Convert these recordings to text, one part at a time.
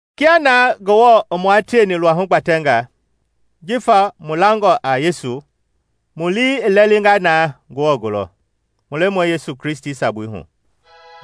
Kia naa Ngewɔ i mua tieni luahu gbatɛnga jifa mu langɔ a Yesu, mu lii i lɛlinga naa Ngewɔ gulɔ, mu Lemɔi Yesu Kristi sabui hu.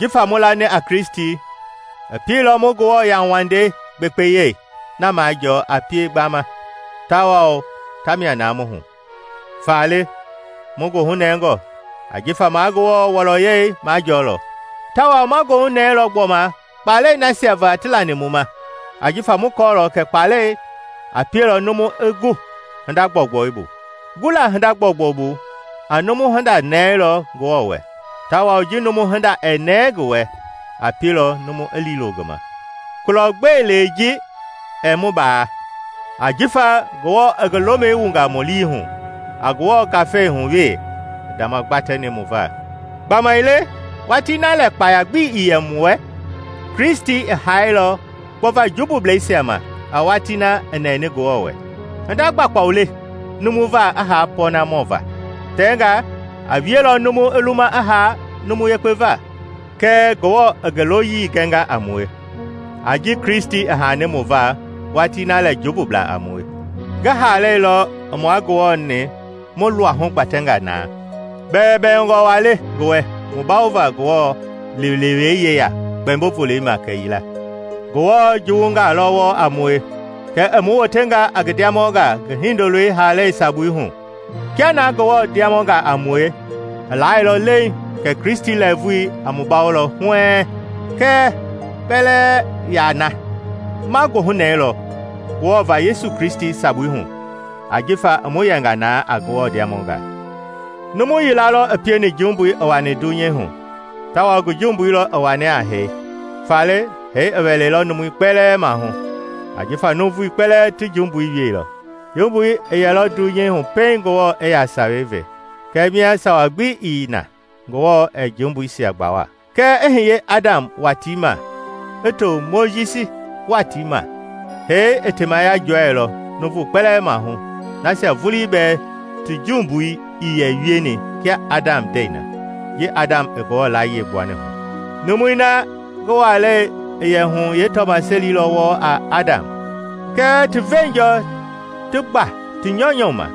Jifa mu lani a Kristi, i pieilɔ mu Ngewɔ yauwandei gbekpeyei na majɔɔ a pie gbama tawao tamia naa mu hu. Faale, mu goohunɛngɔ ajifa ma Ngewɔ wɔlɔyɛi majɔɔlɔ. Tawao ma goohunɛɛlɔ gbɔma kpalɛi nasia va ti lani mu ma ajifa mu kɔɔlɔ kɛ kpaalɛi a pieilɔ numu i gu hinda gbɔugbɔi bu, gula hinda gbɔugbɔi bu a numu hinda nɛɛlɔ Ngewɔ wɛ, tawao ji numu hinda a nɛɛ ngi wɛ a pielɔ numu i liilo ngi ma. Kulɔ gbe lee ji ɛɛ mu baa, ajifa Ngewɔ i ngi lomi wunga mu liihu, a Newɔ Ngafei hu we i ndamagbatɛni mu va. Gbamaile watii na lɛ kpaya gbi ii yɛ mu wɛ, Kristi i haailɔ gbɔva jumbubleisia ma a watii na i nɛni Ngewɔ wɛ. Hinda kpaukpau le numu va i haa pɔɔnamɔ va. Tɛngaa a wielɔ numu i luma i haa numu yekpe va. Kɛɛ Ngewɔ i ngi loyii a mue gɛnga a mue, a ji Kristi i haani mu va watii na lɛ jumbublaa a mue. Ngi haalei lɔ i mua Ngewɔ-ni mu luahu gbatɛnga na; bɛwɛbɛwɛngɔ waa le ngi wɛ mu bawova Ngewɔ liilewei yeya kpɛmbo-volei ma kɛyila. Ngewɔ juwungaa lɔ wɔɔ a mue, kɛɛ i mu wotenga a ngi ndiamɔngaa ngi Hindoloi haalei yɛ sabui va. Kia naa Ngewɔ ndiamɔngaa a mue, i laailɔ leiŋ kɛ Kristi lɛɛvui a mu bawolɔ huɛɛŋ! Kɛɛ kpɛlɛɛ yaa na; ma goohunɛilɔ Ngewɔ va Yesu Kristi sabui hu ajifa i mu yɛnga naa a Ngewɔ ndiamɔngaa. Numu yila lɔ i pieni jumbui i wani dunyei hu tawao ngi jumbui lɔ i wani a hee. Faale hee i wɛlɛilɔ numui kpɛlɛɛ maahu, ajifa nuuvui kpɛlɛɛ ti jumbui wieilɔ. Jumbui i yɛlɔ dunyei hu pɛiŋ Ngewɔ i yaa Sawei ve; kɛɛ mia sawa gbi ii na, Ngewɔ ɛɛ jumbuisia gbawa. Kɛɛ i hiye Adam watii ma i to Mojisi watii ma, hee i temaya jɔɛilɔ nuuvu kpɛlɛɛ maahu, nasia vulii bɛɛ ti jumbui ii yɛ wieni kia Adam ndɛi na, ji Adam i Ngewɔ layie gbuani hu. Numui na ngi walei i yɛ hu yeetɔmaseli lɔ wɔɔ a Adam. Kɛɛ ti veenjɔɔ ti gba ti nyɔunyɔ ma,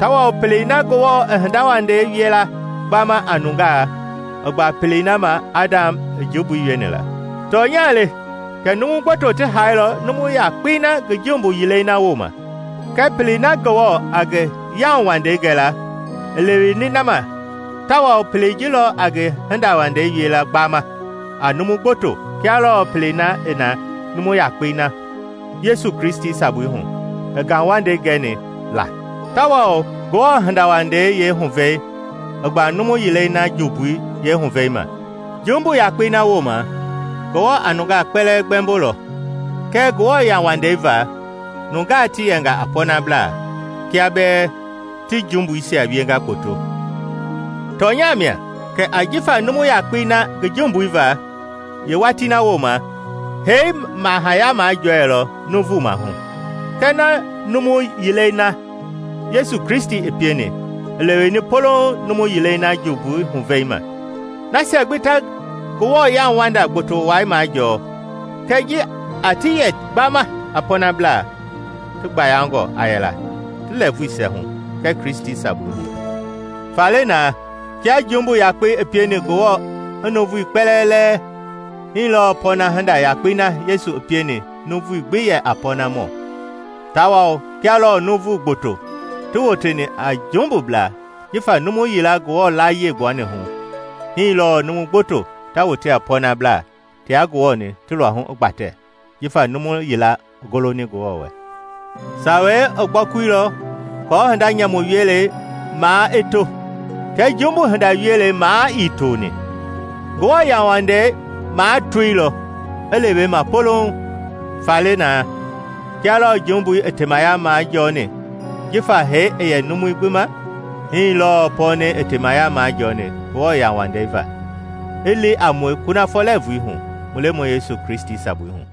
tawao pelei na Ngewɔ a hindawandei wiela gbama a nungaa i gba pelei na ma Adam i jumbui wieni la. Tɔnya le kɛ numu gboto ti haailɔ numu yakpei na ngi jumbui yilei na wooma. Kɛɛ pelei na Ngewɔ a ngi yauwandei gɛla i leweni na ma tawao pelei ji lɔ a ngi hindawandei wie la gbama a numu gboto kia lɔɔ pelei na i na numu yakpei na, Yesu Kristi sabui hu, i ngauwandei gɛni la. Tawao Ngewɔ hindawandei yeehuvɛi i gba numu yilei na jumbui yeehuvɛi ma. Jumbu yakpei na wooma, Ngewɔ a nungaa kpɛlɛɛ gbɛmbo lɔ; kɛɛ Ngewɔ yauwandei va, nungaa ti yɛnga a pɔɔnablaa kia bɛɛ ti jumbuisia wienga kpoto. Tɔnya mia kɛ ajifa numu yakpei na ngi jumbui va, yeewatii na wooma, hee mahaya majɔɛilɔ nuuvu mahu. Kɛɛ na numu yilei na, Yesu Kristi i pieni, i leweni polouŋ numu yilei na jumbui yeehuvɛi ma. Nasia gbi ta Ngewɔ yauwanda gboto wai majɔɔ kɛ ji a ti yɛ gbaama a pɔɔnablaa, ti gbayangɔ a yɛla ti lɛɛvuisia hu Kristi sabui hu. Faale na, kia jumbu yakpei i pieni Ngewɔ i nuuvui kpɛlɛɛ lɛɛ, hii lɔɔ pɔɔna hinda yakpei na Yesu i pieni nuuvui gbi yɛ va a pɔɔnamɔ. Tawao kia lɔɔ numu gboto ti woteni a jumbublaa jifa numu yila Ngewɔ layie gbuani hu, hii lɔɔ numu gboto ta wote a pɔɔnablaa tia Ngewɔ-ni ti luahu i gbatɛ jifa numu yila i goloni Ngewɔ wɛ. Sawei i gbɔkuilɔ aako hinda nyamu wielei maa i to; kɛɛ jumbu hinda wielei maa ii toni, Ngewɔ yauwandei maa toilɔ i lewe ma polouŋ. Faale na, kia lɔɔ jumbui i temaya majɔɔni jifa hee i yɛ numui gbi ma, hii lɔɔ pɔɔnɛi i teemaya majɔɔni Ngewɔ yauwandei va, i li a mue kunafɔ lɛɛvui hu mu Lemɔi Yesu Kristi sabui hu.